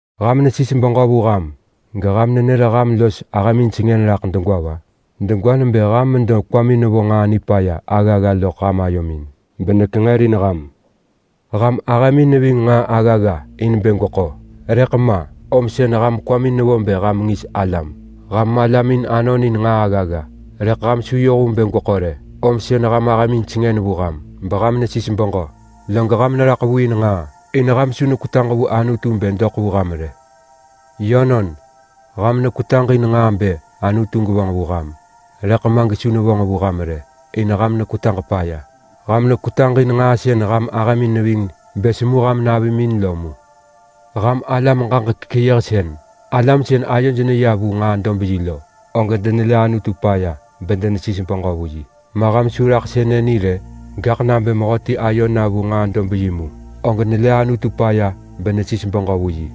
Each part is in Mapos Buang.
Ham nesis beġö vu ham geham nenër ham los ahëmin sengën raḳ degwa va? Degwa nebë ham medo mekwamin nevo nġaa nipaya aggagga loḳ ayomin benekenġërin ham. Ham ahëmin neving nġaa aggagga in bë gweko, rëḳ ma, om sën ham kwamin nevo bë ham ngis alam. Ham malamin anonin nġaa aggagga rëḳ ham su yoh vu bë gweḳo rë, om sën ham ahëmin sengën vu ham beham nesis beġö. Log ham neraḳ vu in nġaa, in ham su nekwetaġ vu Anutu bë doḳ vu ham rë. Yönon, ham nekwetaġ in nġaa bë Anutu gevonġ vu ham, rëḳ ma gesu nevonġ vu ham rë in ham nekwetaġ paya. Ham nekwetaġ in nġaa sën ham ahëmin neving bë semu ham navimin lo mu. Ham alam ġaġek keyëhsën! Alam sën ayoj neya vu nġaa-dob-yi lo, og denelë Anutu paya bedenesis beġö vu yi, ma ham su neraḳ sënë ni rë? Gaḳ nabë mehöti ayo na vu nġaa-dob-yi mu, og nelë Anutu paya benesis beġö vu yi.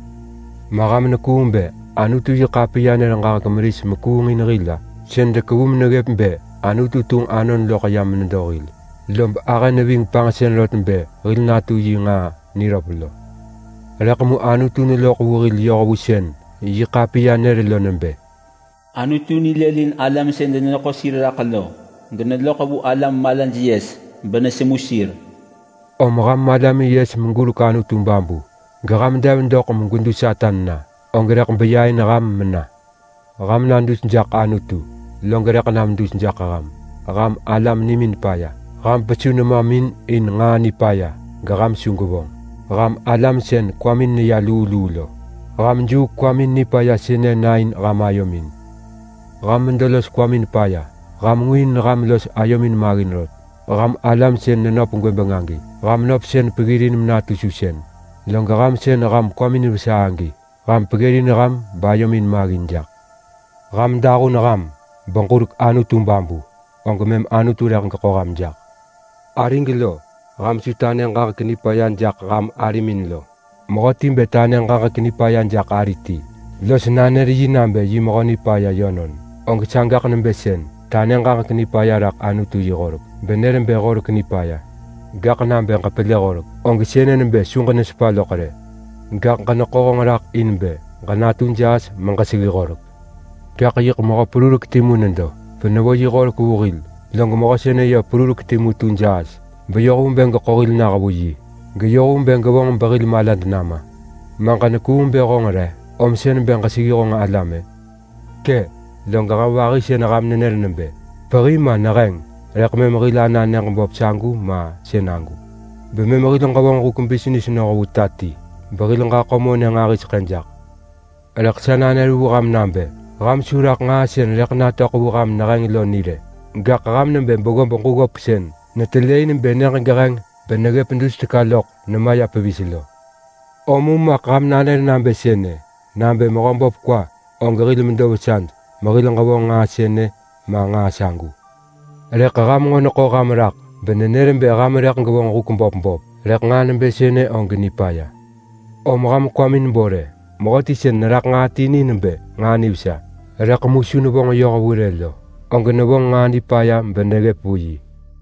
Ma ham nekuung bë Anutu-yi-ḳapiya nër ġaġek meris mekuungin hil-a? Sën dekevu meneggëp bë Anutu tunġ Anon loḳ yam nedo hil lob ahë neving panġsën rot bë hil natu yi nġaa niröp lo? Rëḳ mu Anutu neloḳ vu hil yoh vu sën yi ḳapiya nër lo nebë: “Anutu nilëlin alam sën deneḳo sir raḳ lo geneloḳ vu alam malaj yes benesemu sir.” Om ham malamin yes meġurek Anutu babu, geham dev doḳ megwedu Satan na, og rëḳ beya in ham mena. Ham na dus jaḳ Anutu, log rëḳ nam dus jaḳ ham. Ham alam nimin paya. Ham pesu nemamin in nġaa nipaya geham su gwevonġ! Ham alam sën kwamin neya luu luu lo, ham juuk kwamin nipaya sënë na in ham ayomin! Ham medo los kwamin paya! Ham ngu in ham los ayomin maggin rot! Ham alam sën nenöp gwëbeng agi, ham nöpsën peggirin menatu susën. Log ham sën ham kwamin vesa agi, ham peggirin ham bayomin maggin jaḳ. Ham dahun ham beġurek Anutu babu og mëm Anutu rëḳ geḳo ham jaḳ. Arig lo, ham su tanë ġaġek nipaya jaḳ ham arimin lo. Mehöti bë tanë ġaġek nipaya jaḳ ari ti los nanër yi nabë yi mehö nipaya yönon, og sagaḳ nebë sën tanë ġaġek nipaya raḳ Anutu yi horek benër bë horek nipaya. Gaḳ nabë ġepelë horek og sënë nebë su ġenesepa loḳ rë, gaḳ ġeneḳo honġ raḳ in bë ġenatu jaas meġeseggi horek. Gaḳ yiḳ mehö perurek timu nedo benevo yi horek vu hil. Log mehö sënë perurek timu tu jaas beyoh vu bë geḳo hil nah vu yi, geyoh vu bë gevonġ behil malad nama. Ma ġenekuung bë honġ re om sën bë ġeseggi honġ alam-ë? Kë! Log ham vahi sën ham nenër nebë, “Pehi, ma neheng, rëḳ mëm hil ana nyëġ böp sagu ma sënagu, bemëm hil ġevonġ huk bisnis noh vu ta ti behil ġaḳo monë nġahiseḳë jaḳ!” Rëḳ sa nanër vu ham nabë, “Ham su raḳ nġaa sën rëḳ natöḳ vu ham neheng lo ni rë!” Gaḳ ham nebë beggob ġuggop sën netelë in bë nyëġ geheng beneggëp dus teka loḳ nemaya pevis lo. Om mu maḳ ham nanër nabë sënë, “Nabë Mehöböp kwa, og hil medo vesad mehil ġevonġ nġaa sënë ma nġaa sagu.” Rëḳ ham nġo neḳo ham raḳ benenër bë ham rëḳ gwevonġ huk böp böp, rëḳ nġaa nebë sënë og nipaya. Om ham kwamin bo rë! Mehöti sën neraḳ nġaa ti ni nebë nġaa nivesa rëḳ mu su nevonġ yoh vu rë lo, og nevonġ nġaa nipaya beneggëp vu yi.